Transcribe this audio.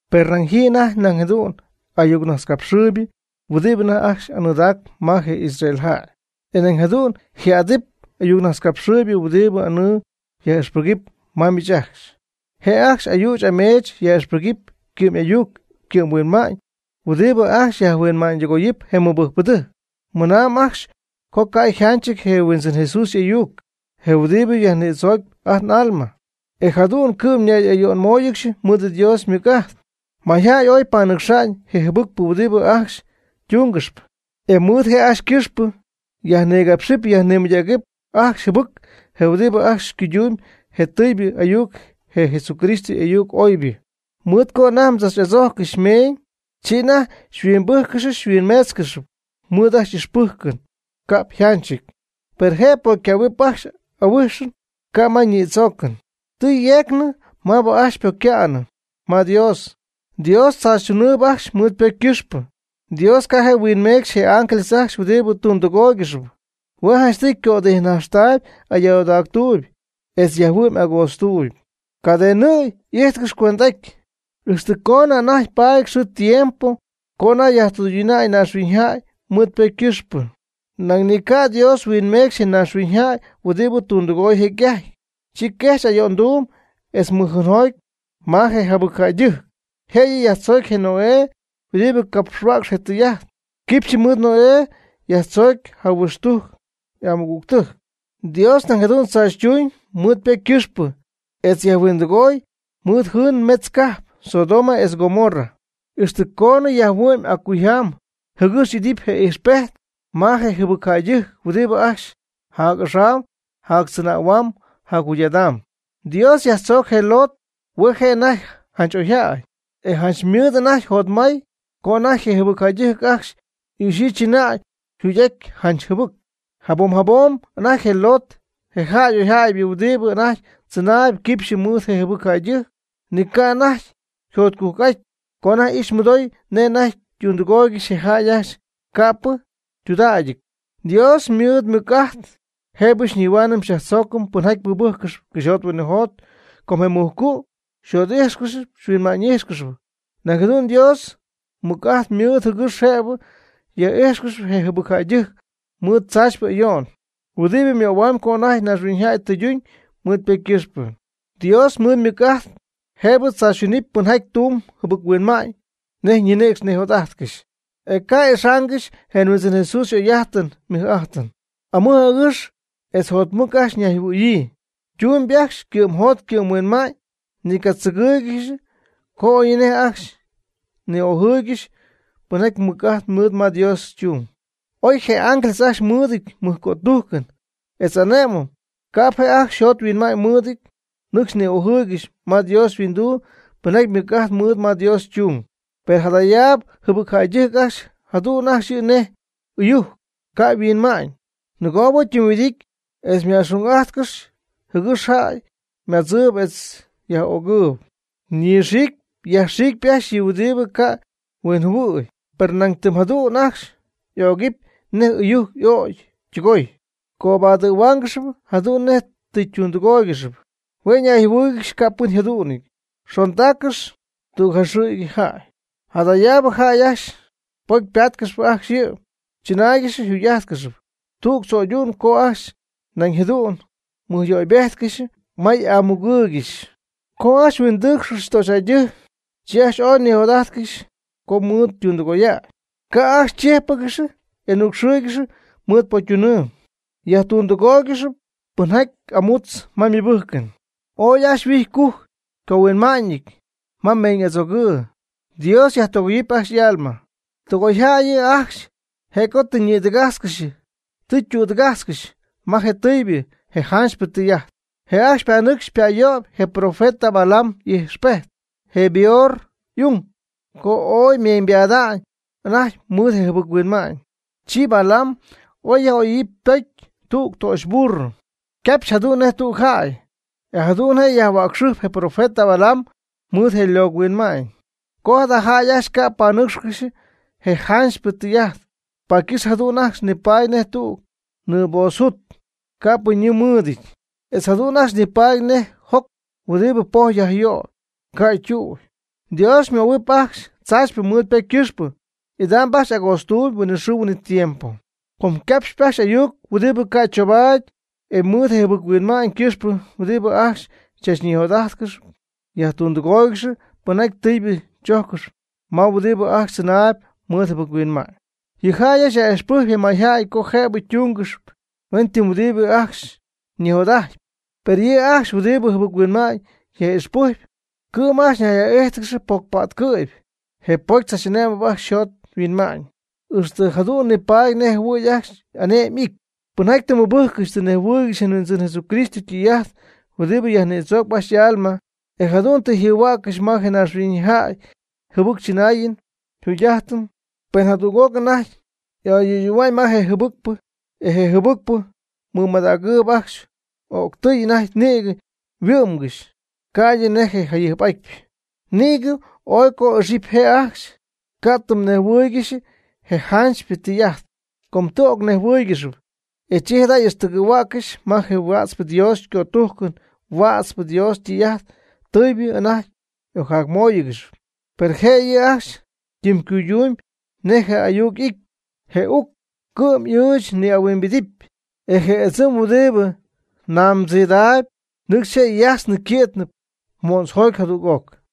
Per nañ ji anajty nañ jadu'n ayucnajtzcapxɨɨybɨ huɨdibɨ anajty ajcxy anɨɨdaacp ma je Israel jäy. E nañ jadu'n yji'adɨpy ayuccapxhuäcxpɨ huɨdibɨ anɨɨ yaj'ixpɨgɨpy ma miich ajcxy. Je' ajcxy ayüch ameech yaj'ixpɨgɨpy ycɨ'm'ayuc ycɨ'mhuinma'ñ huɨdibɨ ajcxy yajhuinma'ñydɨgooyɨpy je mɨbɨjcpɨdɨjc. Ymɨna'ñ ajcxy co ca' yjanchɨty je Huindzɨn Jesús y'ayuc, je huɨdibɨ yajnïdzooc ajt n'alma, e jadu'n cɨ'm ñay'ayo'nmóoyɨgɨxy mɨɨd Dios mɨc'amy. Mayjäy ooy panɨcxa'ñ je jɨbɨcpɨ huɨdibɨ ajcxy ytungɨxyp, e mɨɨd je' ajcxy ycɨxpɨ yajnigápxɨpy yajnimɨydägɨpy ajcxy jɨbɨc je huɨdibɨ ajcxy cuydumb je tɨɨybɨ ayuc, je Jesucristo y'ayuc oybɨ. Mɨɨd co anajty tzach'adzojccɨxy meeñ, chi anajty xyhuimbɨjccɨxy xyhuimmeetzcɨxy mɨɨd ajcxy y'ixpɨjcɨn ca'p yjanchɨty. Per je pocycähuɨn ajcxy ahuijxɨp, ca' ma ñidzooy. Tɨ yjejcnɨ maabɨ ajcxy ypocyca'nɨ ma Dios. Dios tzaachytunɨɨb ajcxy mɨɨd ypocy ycɨxpɨ. Dios ca' je' huinmeecxy je ángeles ajcxy huɨdibɨ tundɨgooygɨxp. Hue' janchtɨy ycötijnajxtaayb ayoodactuuyb etz yajhuɨ'my agootztuuyb, cadenɨjɨ̈y y'ijtcɨxy cuend'aty, ixtɨ coonɨ anajty paady xɨɨ tiempo co anajty yajtɨyduna'ñ naaxhuiñyjäy mɨɨd ypocy ycɨxpɨ. Nañ ni ca' Dios huinmeecxy je naaxhuiñyjäy huɨdibɨ tundɨgooy jecy'ajty. Chi quejxy ayo'nduu etz mɨjnɨɨgom ma je jɨbɨcjäydɨjc. Jëyɨ yajtzoocy je Noé huɨdibɨ capxhuäcx je tɨy'ajt. Quipxy mɨɨd Noé yajtzoocy jahuixtujc y'amɨgügtɨjc. Dios nañ jadu'n tzaachytuñ mɨɨd ypocy ycɨxpɨ etz yajhuindɨgoy mɨɨd jɨɨn metz cajp, Sodoma etz Gomorra, ixtɨ coonɨ yajhuɨ'my accuyjam jɨgɨx y'idɨpy je ijxpejt ma je jɨbɨcjäydɨjc huɨdibɨ ajcxy jac'axam jactzɨnähuam jacjugy'adam. Dios yajtzooc je Lot, hue' je' anajty janch oyjäy, e janch ymɨɨd anajty jotmay co anajty je jɨbɨcjäydɨjc ajcxy ijxɨ chɨnaayɨn yjugy'ajtɨn janch jɨbɨc. Jabom jabom anajty je Lot, je jäy oyjäybɨ huɨdibɨ anajty tzɨnaayb quipxyɨ mɨɨd je jɨbɨcjäydɨjc, ni ca' anajty yjotcujc'aty co anajty ixy mɨdoy nej anajty ytundɨgooygɨxy je jäy ajcxy ca'pɨ ytudägyɨty. Dios mɨɨd mɨc'ajt jëbɨ nihua'ñ yajtzögy pɨnjaty mɨbɨjccɨxp cɨxyjot huinɨjot co je mujcu' yjot'íjxɨgɨxy huinma'ñ'íjxɨgɨxy. Nañ jadu'n Dios mɨc'ajt mɨɨdɨty jɨgɨx jëbɨ yaj'ijtcɨxy je jɨbɨcjäydɨjc mɨɨd tzaachypɨ ayo'n, huɨdibɨ ymöhuamy co anajty naaxhuiñyjäy tɨyduñ mɨɨd ypocy ycɨxpɨ. Dios ymɨɨd mɨc'ajt jëbɨ tzaachytunɨpy pɨnjaty tumb jɨbɨc-huinma'ñ nej ñinïcx nijot'ajtcɨxy, e ca' ixaangɨxy je Huindzɨn Jesús y'oy'ajtɨn ymɨj'ajtɨn. Amɨj agɨx etz jotmɨc ajcxy nayjɨhuɨ̈yii. Ytumb ajcxy ycɨ'mjot ycɨ'mhuinma'ñ. Ni ycatzɨgɨɨygɨxy co oyñinej ajcxy ni'ojɨɨygɨxy pɨnjaty mɨc'ajt mɨɨd ma Dios ytung. Oy je ángeles ajcxy mɨɨdɨty mɨjcötujcɨn etz ane'mɨn, ca'p je' ajcxy yjot yhuinma'ñ mɨɨdɨty nɨcxy ni'ojɨɨygɨxy ma Dios yhuinduu pɨnjaty mɨc'ajt mɨɨd ma Dios ytung. Per jadayaab jɨbɨcjäydɨjc ajcxy jadu'n ajcxy yɨ' nej ɨyujc, ca' yhuinma'ñ; nɨgoob ytɨmyhuɨdity etz yma'xun'ajtcɨxy jɨgɨx jäy ymadzɨɨyb etz yaj'ögɨɨyb. Ñɨxiicpy yajxiicpy ajcxy yɨ' huɨdib ca' huinjɨhuɨ'y. Per nañ tɨm jadu'n ajcxy y'ögɨpy nej ɨyujc y'ögy ytɨgoy. Cobadɨ̈huaangɨxy jadu'n nej tɨ ytundɨgooygɨxy. Hue' nayjɨhuɨɨygɨxy capɨn yjadu'nɨty, yxondaaccɨxy tüg jaxɨ̈cyjaty. Jadayaab jäy ajcxy pocy ypa'tcɨ̈py ajcxy yɨ' chɨnaaygɨxy yjugy'ajtcɨxy. Tüg tzo'ydu'n co ajcxy nañ jadu'n xymɨjyöybejtcɨxy ma m'amugɨɨygɨxy. Co ajcxy huindɨɨcxcɨxy töxyjäydɨjc, chi ajcxy ooy nijot'ajtcɨxy co mɨɨd tundɨgoya'ñ. Ca'p ajcxy chíjpɨgɨxy y'anucxɨɨygɨxy mɨɨd pocytunɨɨ. Yajtundɨgooygɨxy pɨnjaty amútzɨp ma mɨbɨjcɨn, ooy ajcxy yhuijɨty ycujcɨty ycohuinma'ñɨty ma meeñ'adzoogɨɨ. Dios yajtɨgoyɨɨb ajcxy y'alma. Tɨgoyjäy yɨ' ajcxy, je' co tɨ ñɨɨdɨgajtzcɨxy tɨ ytüdɨgajtzcɨxy ma je tɨɨybɨ je janchypɨ tɨy'ajt. Je' ajcxy ypanɨcxy ypayöyp je profeta Balaam y'ijxpejt, je Beor y'ung, co ooy ymeeñybada'ñ anajty mɨɨd yjɨbɨc-huinma'ñ. Chi Balaam oy yaj'ojyii ypocy tüg töxyburro, ycapxy jadu'n nej tüg jäy, e jadu'n je' yajhuäcxɨjpy je profeta Balaam mɨɨd je' ylocɨhuinma'ñ. Com jada jäy ajcxy ca' panɨcxcɨxy je janchypɨ tɨy'ajt, paady ycɨxp jadu'n ajcxy nipaady nej tüg nɨɨpozojut ca'pɨ ñɨɨ mɨɨdɨty, etz jadu'n ajcxy nipaady nej joc huɨdibɨ poj yajyöyɨp (ca' ytu'y). Dios möhuɨɨb ajcxy tzaachypɨ mɨɨd ypocy ycɨxpɨ, idam ajcxy agootztuuyb huinɨxɨɨ huinɨtiempo. Com ycapxyp ajcxy ayuc huɨdibɨ ca' choubaady. E mɨɨd je jɨbɨc-huinma'ñ ycɨxpɨ huɨdibɨ ajcxy chachnijot'ajtpy yajtundɨgooygɨxy pɨnjaty tɨɨbɨ choongɨxy ma je huɨdibɨ ajcxy tzɨnaayb mɨɨd jɨbɨc-huinma'ñ. Yɨ' ajcxy yaj'ixpɨjcp je mayjäy co jëbɨ tungɨxy huentɨm ti huɨdibɨ ajcxy ñijot'ajtpy. Per yɨ' ajcxy huɨdib jɨbɨc-huinma'ñ yaj'ixpɨjcp, cɨ'm ajcxy ñay'íjtɨgɨxy pocypa'tcɨ̈py, je pocy tzach'ane'mb ajcxy yjot yhuinma'ñ, ixtɨ jadu'n nipaady nej jɨhuɨ̈y ajcxy ane'my y'ity. Pɨnjaty tɨ ymɨbɨjccɨxy tɨ ñejhuɨɨygɨxy je Huindzɨn Jesucristo ytɨy'ajt huɨdibɨ yajnïdzoocp ajcxy y'alma, e jadu'n tɨ yjɨhuäccɨxy ma je naaxhuiñyjäy yjɨbɨctzɨnaayɨn yjɨbɨcjugy'ajtɨn, pen jadüg'oc anajty y'ayöyɨɨyñɨp ma je jɨbɨcpɨ, e je jɨbɨcpɨ ymɨmadägyii ajcxy, o'ctɨy anajty nïgɨ yhuɨ'mgɨxy ca'ydɨ nej je jayɨjp'atypɨ. Nïgɨ oy co ixyipy je' ajcxy ca' ytɨmnejhuɨɨygɨxy je janchypɨ tɨy'ajt. Com tɨ ocnejhuɨɨygɨxyp, e chi jada' y'ixtɨgɨ̈huäccɨxy ma je huätzpɨ Dios ycötujcɨn huätzpɨ Dios ytɨy'ajt tɨɨbɨ anajty y'ocjamóoyɨgɨxy. Per je' yɨ' ajcxy ytɨmycuydumy nej je ayuc y'ity: “Je uc ycɨ'm'ɨɨch ñihuimbijtpy, e je ɨdzɨm huɨdibɨ namdziidaayb, nɨcxy je' yajtznɨp yquitnɨp mo'ntzjoty jadüg'oc.”